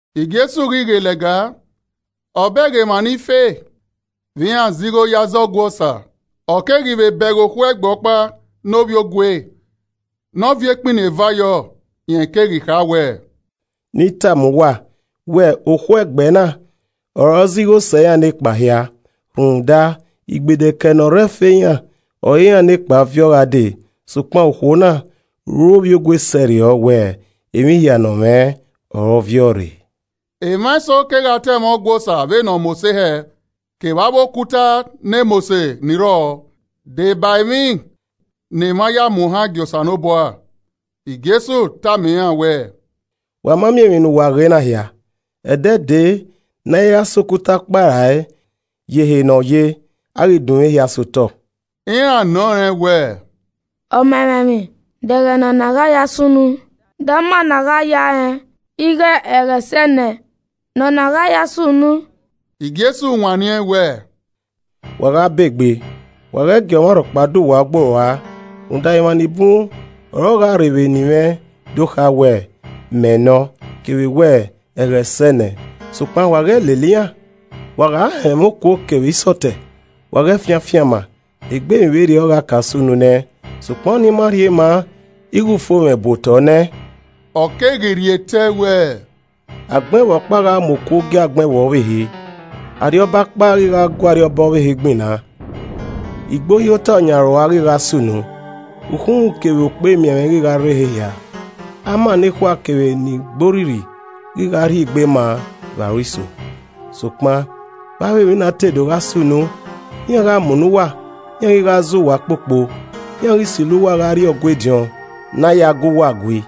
Jesu ghi ghe lẹga, ọ bẹghe emwa ni fe vbe iran zẹ igho ye aza Ọgua Osa. Ọ keghi vbe bẹghe okhuo ẹgbẹ ọkpa ne ovbiogue ne ọ viọ ekpini eva yọ. Rẹn keghi kha wẹẹ, “Ne I tama uwa wẹ okhuo ẹgbẹ na ọre ọ zẹ igho sẹ iran nekpa hia. Rhunmwuda igbedekẹe ne ọ re ẹfe iran ọre iran nekpa viọ gha dee, sokpan okhuo na ru ovbiogue sẹrriọ wẹ emwi hia ne ọ mwẹ ọre ọ viọ rre.” Emwa eso kegha ta ẹmwẹ Ọgua Osa vbe ne ọ mose hẹ kevbe avbe okuta ne mose ni rrọọ de ba emwi ne emwa ya muohan gie Osanobua. Jesu keghi tama iran wẹẹ, “Wa ma miẹn emwi ne uwa ghe na hia, ẹdẹ dee ne a i ra sẹ okuta ọkpa ra e ye ehe ne ọ ye, a ghi dunmwu ehia sotọ.” Iran nọ rẹn wẹẹ, “Ọmamwaemwi, de ẹghẹ ne ọna gha ya sunu? De ama ne a gha ya rẹn ighe ẹghẹ sẹ nẹ ne ọ gha ya sunu?” Jesu wanniẹn wẹẹ, “Wa gha ba egbe, wa ghẹ gie ọmwarhọkpa do uwa ọgboi rua. Rhunmwuda emwa ni bun ọre ọ gha rre vbe eni mwẹ do kha wẹẹ, ‘Mẹ nọ’ kevbe wẹ ‘Ẹghẹ sẹ nẹ!’ Sokpan wa ghẹ lele iran. Wa gha họn ẹmwẹ okuo kevbe isọtẹ, wa ghẹ fian afianma egbe emwi vberriọ gha ka sunu nẹ sokpan ọnii ma rhie maa ighẹ ufomwẹ bu otọ nẹ.” Ọ keghi rhie tẹe wẹẹ, “Agbọn ẹvbo ọkpa gha mu okuo gie agbọn ẹvbo ọvbehe, arriọba ọkpa ghi gha gu ariọba ọvbehe gbinna. Igbohiotọ ọyan aro ua, ghi gha sunu, ukhunmwu kevbe okpemianmwẹ ghi gha rre ehe hia, ama nekhua kevbe ni gbe orrirri ghi gha rhie egbe maa vbe aro iso. Sokpan, vbe avbe emwi na te do gha sunu, iran gha munọ uwa, iran ghi gha zẹ uwa kpokpo, iran ghi silo uwa gha rrie Ọgua ediọn ne a ya gu uwa gui,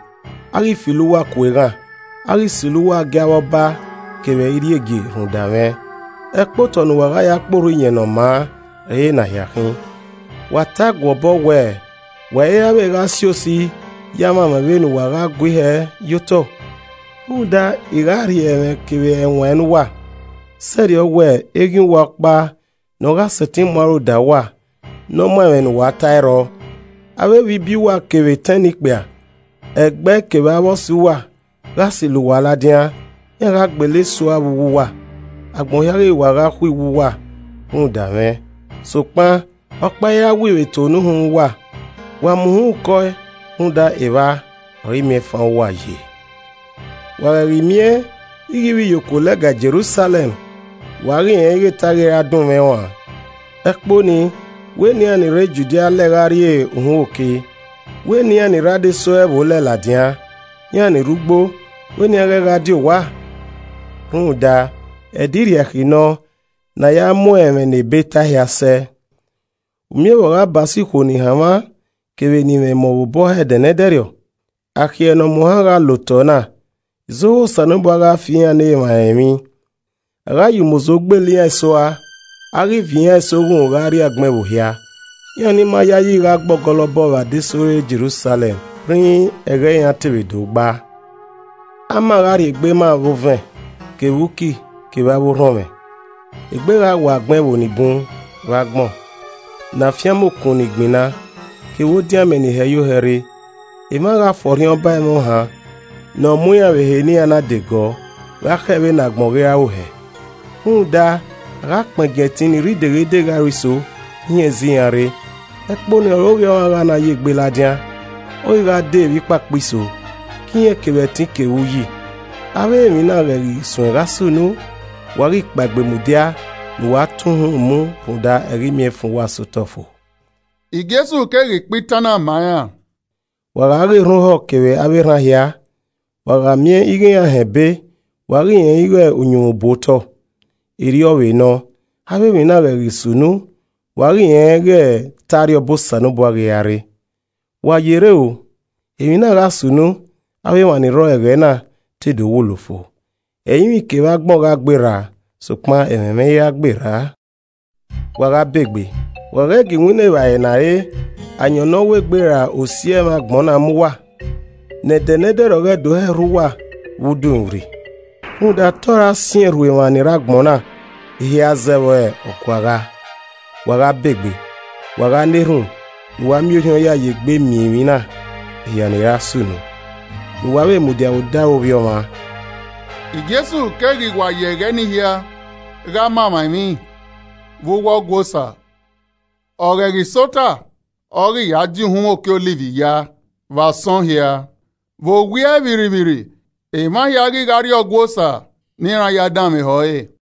a ghi filo uwa ku eghan, a ghi silo uwa gie avbe ọba kevbe irriegie rhunmwuda mwẹ. Ẹkpotọ ne uwa gha ya kpe Orhu Iyẹn Ne ọ Maa ọre ena hia khin. Wa tae guọbọ wẹẹ wa i ra vbe gha si osi ya mwamwa vbene uwa gha gui hẹ ye otọ. Rhunmwuda I gha rhie ẹmwẹ kevbe ẹwaẹn ne uwa, sẹrriọ wẹ eghian uwa ọkpa nọ gha sẹtin mu aro da uwa ne ọ muan ẹmwẹ ne uwa tae, ẹ i rrọọ. Avbe evbibiẹ uwa kevbe etẹn ne ikpia, ẹgbẹe kevbe avbe ọse uwa, gha silo uwa ladian, iran gha gbele eso ua vbe uwu uwa. Agbọn hia ghi wa gha khuiwu uwa rhunmwuda mwẹ. Sokpan ọkpa i ra wii vbe eto ne uhunmwu uwa. Wa mu uhunmwu kọe, rhunmwuda evba ọre imiẹnfan uwa ye. “Wa ghẹ ghi miẹn ighẹ ivbiyokuo lẹga Jerusalẹm, wa ghi rẹn ighẹ te a ghi ra dunmwu ẹn ruan. Ẹkpo nii wẹ ne iran ni re Judia lẹ gha rrie uhunmwu oke, wẹ ne iran ni rre adesẹ ọre ẹvbo lẹ ladian, iran ni rre ugbo, wẹ ne iran ghẹ gha die owa. Rhunmwuda ‘Ẹdẹ Irriakhi’ nọ ne a ya mu ẹmwẹ ne Ebe tae hia sẹ. U miẹn vbe ọ gha ba so ikhuo ni hanmwa kevbe ni mwẹ emọ obọ hẹ ẹdẹ ne ẹdẹrriọ. Akhiẹ ne ọ muohan gha la otọ na, izohu Osanobua gha fi iran ne emwa rẹn emwi. A gha ya umozo gbele iran eso ua, a ghi viọ iran eso oghunmwu gha rrie agbọn ẹvbo hia, iran ni ma yayi ghi gha gbe ọgọlọbọ vbe adesẹ ore Jerusalẹm rhinrin ẹghẹ iran te vbe do gba. “Ama gha rhiegbe ma vbe owẹn, kevbe uki kevbe avbe orhọnmwẹ. Egbe gha wọ agbọn ẹvbo ni bun vbe agbọn, ne afianma okun ni gbinna, kevbe odin amẹ ni hẹ yo hẹ rre. Emwa gha fọrhiọn ba ẹmwẹ ohan nọ mu iran vbe ehe ne iran na de gọọ, gha khẹ vbe ne agbọn ghi ra ru hẹ, rhunmwuda a gha kpẹngiẹn ẹtin ni rre ideghedeghe aro iso hin ẹzi iran rre. Ẹkpo nii ọre Ovbi Ọmwa gha na ye gbe ladian, ọ ghi gha dee vbe ikpakpa iso, ke irẹn kevbe ẹtin kevbe uyi. Avbe emwi na ghẹ ghi suẹn gha sunu, wa ghi kpaegbe mudia ne uwa tọn uhunmwu mu rhunmwuda ẹghẹ imiẹnfan uwa sẹ otọ fo.” Jesu keghi kpa itan na ma iran, “Wa gha ghe erhan ohọ kevbe avbe erhan hia. Wa gha miẹn ighẹ iran họn ebe, wa ghi rẹn ighẹ uhunmwu bu otọ. Erriọ vbe nọ, avbe emwi na ghẹ ghi sunu, wa ghi rẹn ighẹ te Arriọba Osanobua ghi ra rre. “Wa yerre o, emwi na gha sunu avbe emwa ni rrọọ ẹghẹ na te do wulo fo. Ẹrinmwi kevbe agbọn gha gberra sokpan ẹmwẹ mwẹ i ra gberra. “Wa gha begbe! Wa ghẹ gie iwinna evbare ne a re, ayọn ne ọ wegbe ra osi ẹmwẹ agbọn na mu uwa, ne Ẹdẹ nẹdẹrriọ ghẹ do hẹ rhu uwa vbe udomwirri. Rhunmwuda te ọ ra siẹn rhu emwa ni rre agbọn na hia zẹ vbe ọguagha. Wa gha begbe, wa gha na erhunmwu ne uwa miẹn orhiọn ya ye egbe miẹn emwi na hia ni ra sunu, ne uwa vbe mudia vbe odaro Ovbi Ọmwa.” Jesu keghi wa ya ẹghẹ ni hia gha ma emwa emwi vbe uwu Ọgua Osa, ọ ghẹ ghi sẹ ota, ọ ghi ya dia uhunmwu oke Ọliv ya vbe asọn hia. Vbe owiẹ vbirrivbirri, emwa hia ghi gha rrie Ọgua Osa ne iran ya danmwehọ ẹre.